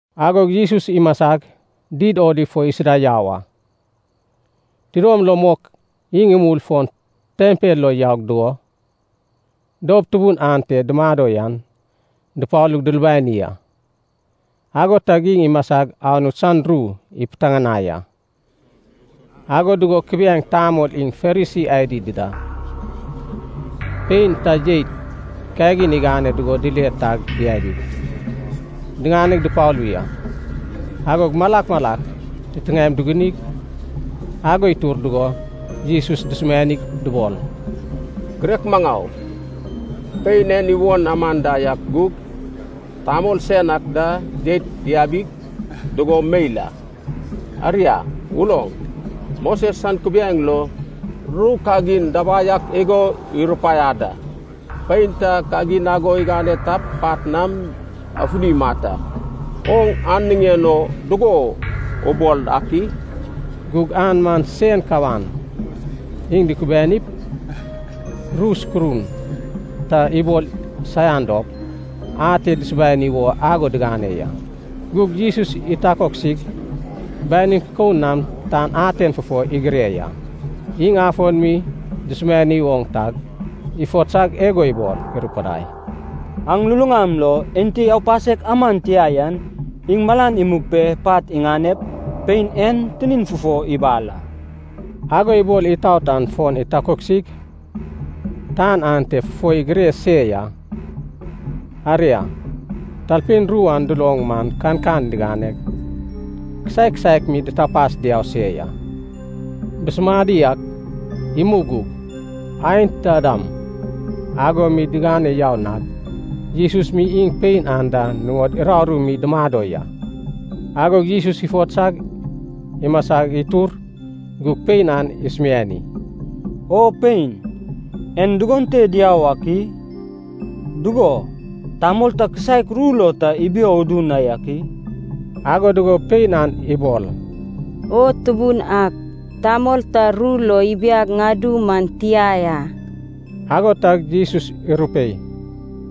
Agog Jesus imasag, Did Oliv fo isida yau a. Tidom lom mok iŋ imul fon tempel lo yau dugo, doup tubun ante dumado yan dupalug dulubani a. Ago tag iŋ imasig Anut san ru ipiteŋanai a. Ago dugo kubiaeŋ tamol iŋ Farisi adi dida, pein ta jeit kagin igane dugo dile tag diabig, diŋane dupalu ya. Agog malak malak titiŋaem dugunig ago itur dugo, Jesus dusumianig dubol, “Girek maŋau, pein en iwon anda ak gug, tamol sen ak da jeit diabi dugo meil a. Aria uloŋ, Moses san kubiaeŋ lo, ru kagin dabai ak igo irupaiad a, pein ta kagin ago igane tap pat nam afuni imat a. Oŋ an niŋen o dugo ubol ak i?” Gug an man sen kawan iŋ dukubianip, ru sukurun ta ibol saian dop, ate dusubani wo ago digane ya. Gug Jesus itakoksig, banin kikoun nam tan aten fufo igire ya. Iŋ afon mi dusumiani oŋ tag, ifotsag igo ibol irupudai, “Aŋ luluŋam lo enti aupasek aman tia yan, iŋ malan imug pe pat iŋanep, pein en tinin fufo ibal a.” Ago ibol itout an fon itakoksig, tan aten fufo igire se ya. Aria, talpein ru an duloŋ man kankan diŋaneg kisaek kisaek mi ditapas diau se ya. Busumadi ak imug gug, aenta dam ago mi digane yau nad, Jesus mi iŋ pein an da nuŋod uraru mi dumado ya. Agog Jesus ifotsag imasa itur gug pein an isumiani, “O pein, en dugon te diau ak i? Dugo, tamol ta kisaek ru lo ta ibio udu na yak i?” Ago dugo pein an ibol, “O Tubun ak, tamol ta ru lo ibiag ŋadu man tia ya.” Ago tag Jesus irupei,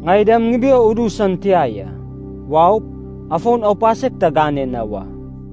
“Ŋai dam ŋibio udu san tia ya. Waup, afon aupasek ta gane na wa.”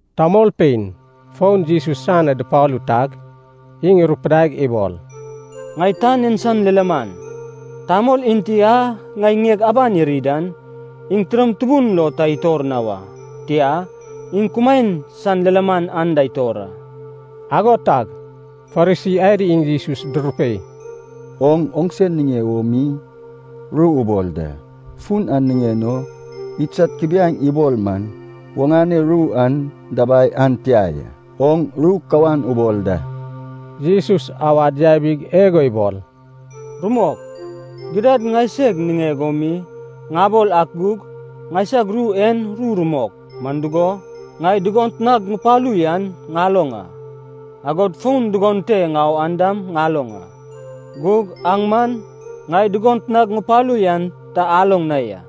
Tamolpein fon Jesus san na dupalu tag, iŋ irupidaig ibol, “Ŋai tan en san lilaman. Tamol enti a ŋai ŋieg aban iri dan, iŋ tidom tubun lo ta itor na wa. Tia, iŋ kumaen san lilaman anda itor a.” Ago tag Farisi adi iŋ Jesus durupei, “Oŋ oŋse niŋe wo mi ru ubol da, fun an niŋen o idsad kubiaeŋ ibol man oŋane ru an dabai an tia ya. Oŋ ru kawan ubol da.” Jesus awad yabig igo ibol, “Rumok, gidad ŋaiseg niŋeg o mi ŋabol ak gug, ŋaisag ru en ru rumok. Man dugo, ŋai dugot nag ŋupalu yan ŋaloŋ a, agod fon dugon te ŋau an dam ŋaloŋ a. Gug aŋ man ŋai dugot nag ŋupalu yan ta aloŋ na ya,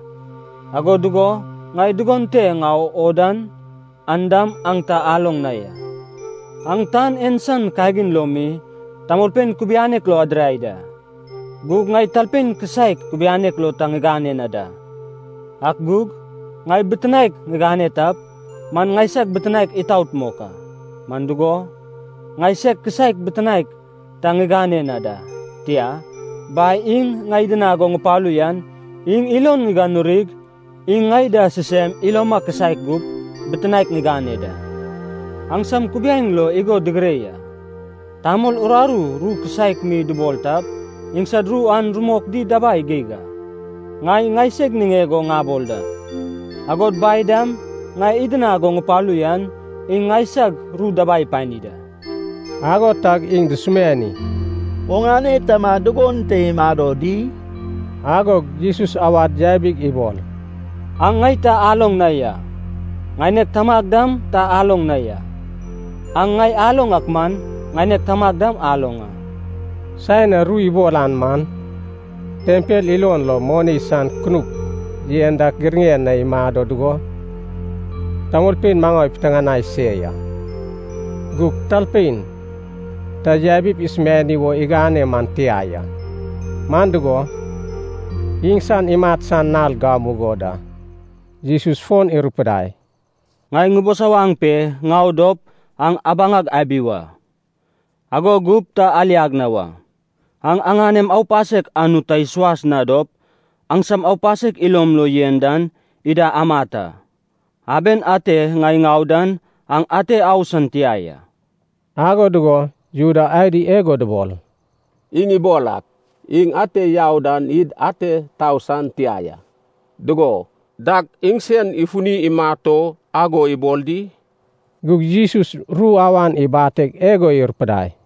ago dugo ŋai dugon te ŋau o dan, an dam aŋ ta aloŋ na ya. Aŋ tan en san kagin lo mi tamolpein kubianek lo adirai da, gug ŋai talpein kisaek kubianek lo ta ŋigane na da. Ak gug, ŋai bitinaek ŋigane tap, man ŋaisag bitinaek itaot mok a. Man dugo, ŋai seg kisaek bitinaek ta ŋigane na da, tia, Bai iŋ ŋai idinag go ŋupalu yan, iŋ ilon ŋiganurig iŋ ŋai da sisem iloma kisaek gup, bitinaek ŋigane da. Aŋsam kubiaeŋ lo igo digire ya, tamol uraru ru kisaek mi dubol tap, iŋsad ru an rumok di dabai geig a. Ŋai ŋaiseg niŋeg o ŋabol da, agod Bai dam ŋai idinag go ŋupalu yan, iŋ ŋaisag ru dabai ipani da.” Ago tag iŋ dusumiani, “Oŋane tama dugon te imado di?” Agog Jesus awad yabig ibol, “Aŋ ŋai ta aloŋ na ya, ŋaineg Tamag dam ta aloŋ na ya. Aŋ ŋai aloŋ ak man, ŋaineg Tamag dam aloŋ a.” Saen a ru ibol an man, tempel ilon lo moni san kunup yen dak giraŋen na imado dugo, tamolpein maŋau ipiteŋanai se ya. Gug talpein ta yabip isubani wo igane man tia ya. Man dugo, iŋsan imat san nal gamugo da. Jesus fon irupidai, “Ŋai ŋubisawaŋ pe ŋau dop aŋ abaŋag abi wa, ago gup ta aliag na wa. Aŋ aŋanem aupasek Anut ta isuas na dop, aŋsam aupasek ilom lo yen dan ida amat a. Aben ate ŋai ŋau dan aŋ ate au san tia ya.” Ago dugo Juda adi igo dubol, “Iŋ ibol ak, iŋ ate yau dan id ate tau san tia ya. Dugo, dag iŋsen ifuni imat o ago ibol di?” Gug Jesus ru awan ibateg igo irupudai,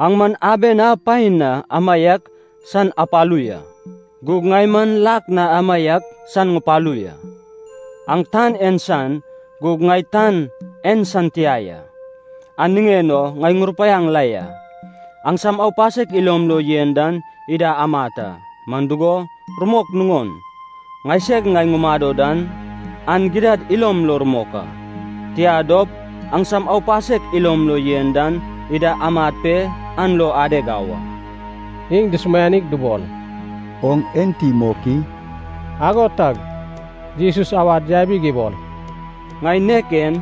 “Aŋ man aben a paen na amaiak san apalu ya, gug ŋai man lak na amaiak san ŋupalu ya. Aŋ tan en san, gug ŋai tan en san tia ya. An niŋen o ŋai ŋurupaiaŋ la ya, aŋsam aupasek ilom lo yen dan ida amat a. Man dugo, rumok nuŋon, ‘Ŋaiseg Ŋai Ŋumado Dan’ an gidad ilom lo rumok a. Tia dop, aŋsam aupasek ilom lo yen dan ida amat pe an lo adeg au a.” Iŋ dusumianig dubol, “Oŋ enti mok i?” Ago tag Jesus awad yabig ibol, “Ŋai nek en,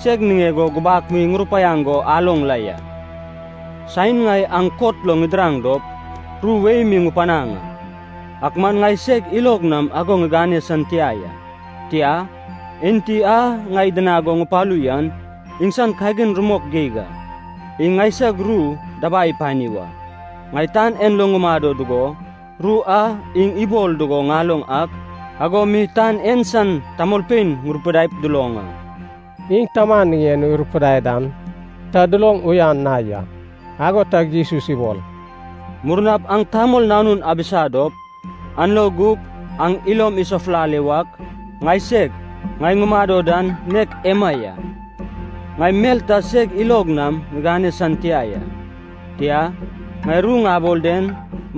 seg niŋeg o gubak mi ŋurupaiaŋ go aloŋ la ya. Saen ŋai aŋ kot lo ŋidiraŋ dop, ru wei mi ŋupanaŋ a. Ak man ŋai seg ilog nam ago ŋigane san tia ya. Tia, Enti a ŋai idinag go ŋupalu yan, iŋsan kagin rumok geig a, iŋ ŋaisag ru dabai ipani wa. Ŋai tan en lo ŋumado dugo, ru a iŋ ibol dugo ŋaloŋ ak ago mi tan en san tamolpein ŋurupidaip duloŋ a.” Iŋ Taman niŋen o irupudai dan ta duloŋ uyan na ya. Ago tag Jesus ibol, “Murnap aŋ Tamol Nanun abisa dop, an lo gup aŋ ilom isafulale wak, ‘Ŋaiseg, Ŋai Ŋumado Dan’ nek ema ya. Ŋai mel ta seg ilog nam ŋigane san tia ya, tia, ŋai ru ŋabol den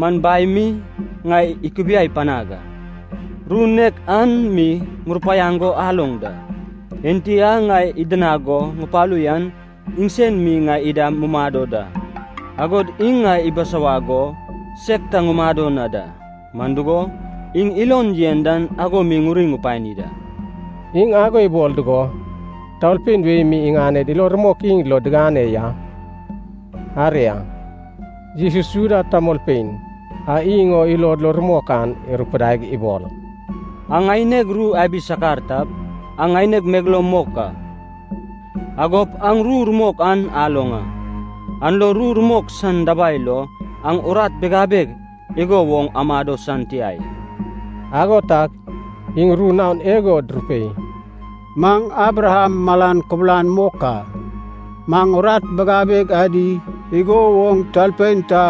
man Bai mi ŋai ikubiai panag a, ru nek an mi ŋurupaiaŋ go aloŋ da. Enti a ŋai idinag go ŋupalu yan iŋsen mi ŋai ida mumado da, agod iŋ ŋai ibisawag go seg ta ŋumado na da. Man dugo, iŋ ilon yen dan ago mi ŋuri ŋupani da.” Iŋ ago ibol dugo, tamolpein wei mi iŋaned ilo rumok iŋ lo digane ya. Aria, Jesus Juda tamolpein a iŋ o ilod lo rumok an irupudaig ibol, “Aŋ ŋaineg ru abi sakar tap, aŋ ŋaineg megeloum mok a. Agop aŋ ru rumok an aloŋ a. An lo ru rumok san dabai lo aŋ urat bigabeg igo woŋ amado san tia ya.” Ago tag iŋ ru naon igo durupei, “Maŋ Abraham malan kubulan mok a, maŋ urat bigabeg adi igo woŋ talpein ta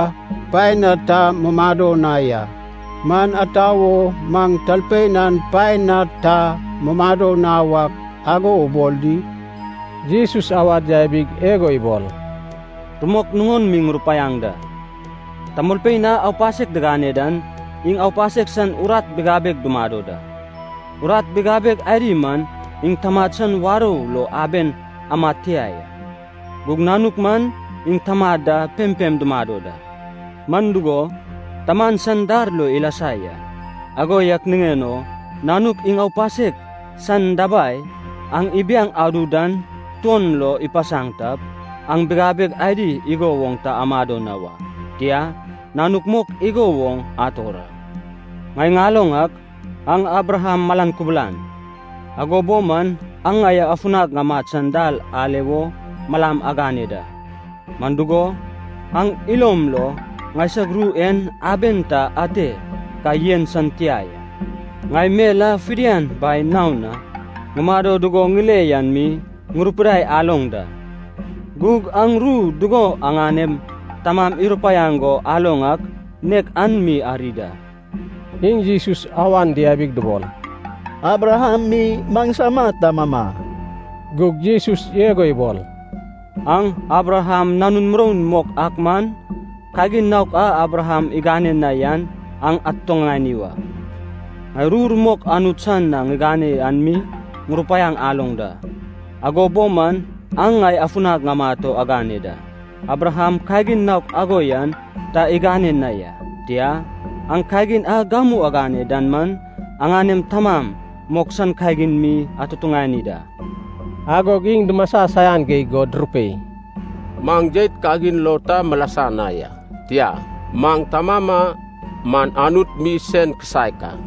paen na ta mumado na ya. Man ata wo maŋ talpein an paen na ta mumado na wak, ago ubol di?” Jesus awad yabig igo ibol, “Rumok nuŋon mi ŋurupaiaŋ da. Tamolpein a aupasek digane dan iŋ aupasek san urat bigabeg dumado da. Urat bigabeg adi man iŋ tamad san warou lo aben amad tia ya. Gug nanuk man iŋ taman da pempem dumado da, man dugo, taman san dar lo ilasa ya. Ago yak niŋen o Nanuk iŋ aupasek san dabai aŋ ibiaŋ adu dan tuon lo ipasaŋ tap, aŋ bigabeg adi igo woŋ ta amado na wa, tia, nanuk mok igo woŋ ator a. Ŋai ŋaloŋ ak, aŋ Abraham malan kubulan. Ago bo man aŋ ŋai afunag ŋamat san dal ale wo malam agane da. Man dugo, aŋ ilom lo ŋaisag ru en aben ta ate ka yen san tia ya. Ŋai mel a fidian Bai naon na ŋumado dugo ŋile yan mi ŋurupidai aloŋ da. Gug aŋ ru dugo aŋanem tamam irupaiaŋ go aloŋ ak, nek an mi ari da.” Iŋ Jesus awan diabig dubol, “Abraham mi maŋsama tamama.” Gug Jesus igo ibol, “Aŋ Abraham nanun muroun mok ak man, kagin naok a Abraham igane na yan aŋ atutuŋani wa. Ŋai ru rumok Anut san na ŋiŋane an mi ŋurupaiaŋ aloŋ da. Ago bo man aŋ ŋai afunag ŋamat o agane da. Abraham kagin naok ago yan ta igane na ya. Tia, aŋ kagin a gamu agane dan man, aŋanem taman mok san kagin mi atutuŋani da.” Agog iŋ dumasa saian geig go durupei, “Maŋ jeit kagin lo ta milasa na ya. Tia, maŋ tamama man Anut mi sen kisaek a.”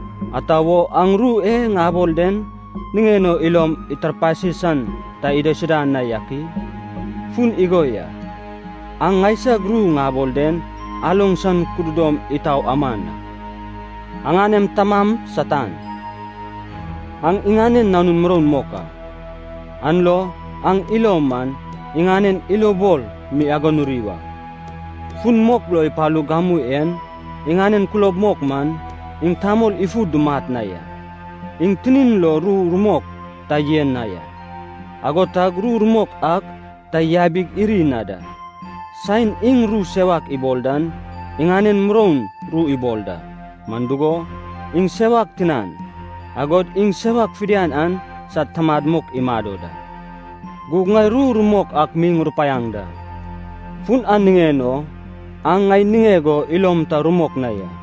Ata wo aŋ ru e ŋabol den niŋen o ilom itarpasi san ta idaisuda na yak i? Fun igo ya, aŋ ŋaisag ru ŋabol den aloŋ san kududom itau aman a. Aŋanem tamam Satan, aŋ iŋanen nanun muroun mok a. An lo aŋ ilom man, iŋanen ilobol mi aganuri wa. Fun mok lo ipalug gamu en, iŋanen kulob mok man, iŋ tamol ifu dumat na ya. Iŋ tinin lo ru rumok ta yen na ya, ago tag ru rumok ak ta yabig iri na da. Saen iŋ ru sewak ibol dan, iŋanen muroun ru ibol da. Man dugo, iŋ sewak tinan, agod iŋ sewak fidian an sad tamad mok imado da. Gug ŋai ru rumok ak mi ŋurupaiaŋ da, fun an niŋen o aŋ ŋai niŋeg o ilom ta rumok na ya!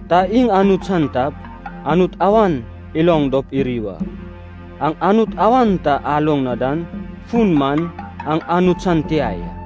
Ta iŋ Anut san tap, Anut awan iloŋ dop iri wa. Aŋ Anut awan ta aloŋ na dan fun man, aŋ Anut san tia ya.”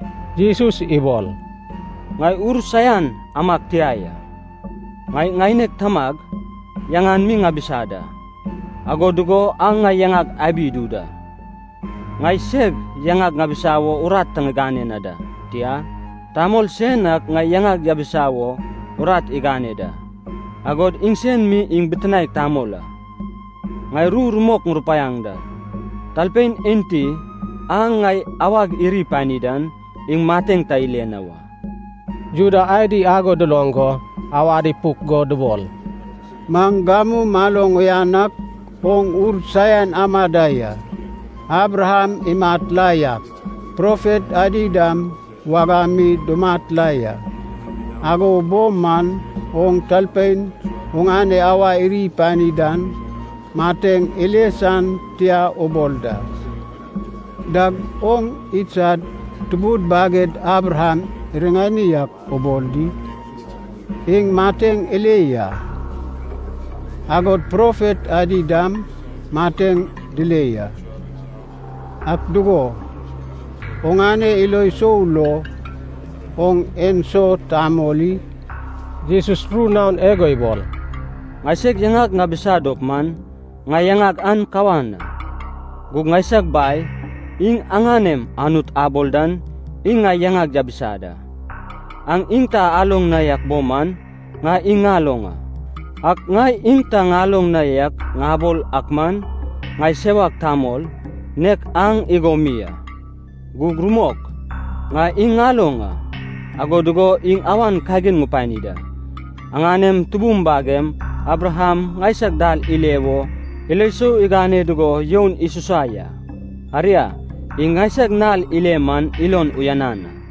Jesus ibol, “Ŋai ur saian amag tia ya. Ŋai ŋaineg Tamag yaŋan mi ŋabisa da, ago dugo aŋ ŋai yaŋag abi idu da. Ŋai seg yaŋag ŋabisa wo urat ta ŋigane na da. Tia, Tamol sen ak ŋai yaŋag yabisa wo urat igane da, agod iŋsen mi iŋ Bitinaek Tamol a. Ŋai ru rumok ŋurupaiaŋ da, talpein enti a ŋai awag iri ipani dan, iŋ mateŋ ta ile na wa.” Juda adi ago duloŋ go awad ipuk go dubol, “Maŋ gamu maloŋ uyan ak, oŋ ur saian ama da ya. Abraham imat la yak, profet adi dam wagam mi dumat la ya. Ago bo man oŋ talpein oŋane awa iri ipani dan mateŋ ile san tia ubol da. Dag oŋ idsad tubud baged Abraham riŋani ak ubol di? Iŋ mateŋ ile ya. Agod profet adi dam mateŋ dile ya. Ak dugo, oŋane ilo sou lo, oŋ enso tamol i?” Jesus ru naon igo ibol, “Ŋaiseg yaŋag ŋabisa dop man, ŋai yaŋag an kawan a. Gug ŋaisag Bai, iŋ aŋanem Anut abol dan, iŋ ŋai yaŋag yabisa da. Aŋ iŋ ta aloŋ na yak bo man ŋai iŋ ŋaloŋ a. Ak ŋai iŋ ta ŋaloŋ na yak ŋabol ak man, ŋai sewak tamol, nek aŋ igo mi a. Gug rumok, ŋai iŋ ŋaloŋ a, ago dugo iŋ awan kagin ŋupani da. Aŋanem tubum bagem Abraham ŋaisag dal ile wo ilo sou igane dugo youn isusa ya. Aria, iŋ ŋaisag nal ile man ilon uyanan a.”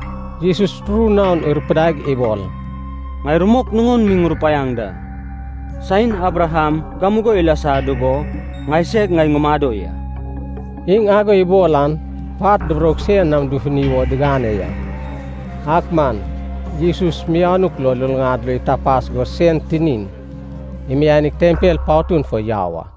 Jesus ru naon irupidaig ibol, “Ŋai rumok nuŋon mi ŋurupaiaŋ da. Saen Abraham gamugo ilasa dugo Ŋaiseg, Ŋai Ŋumado Ya.” Iŋ ago ibol an pat duburoug sen nam dufuni wo digane ya, ak man Jesus mianuk lo luluŋad lo itapas go sen tinin imianig tempel patun fo yau a.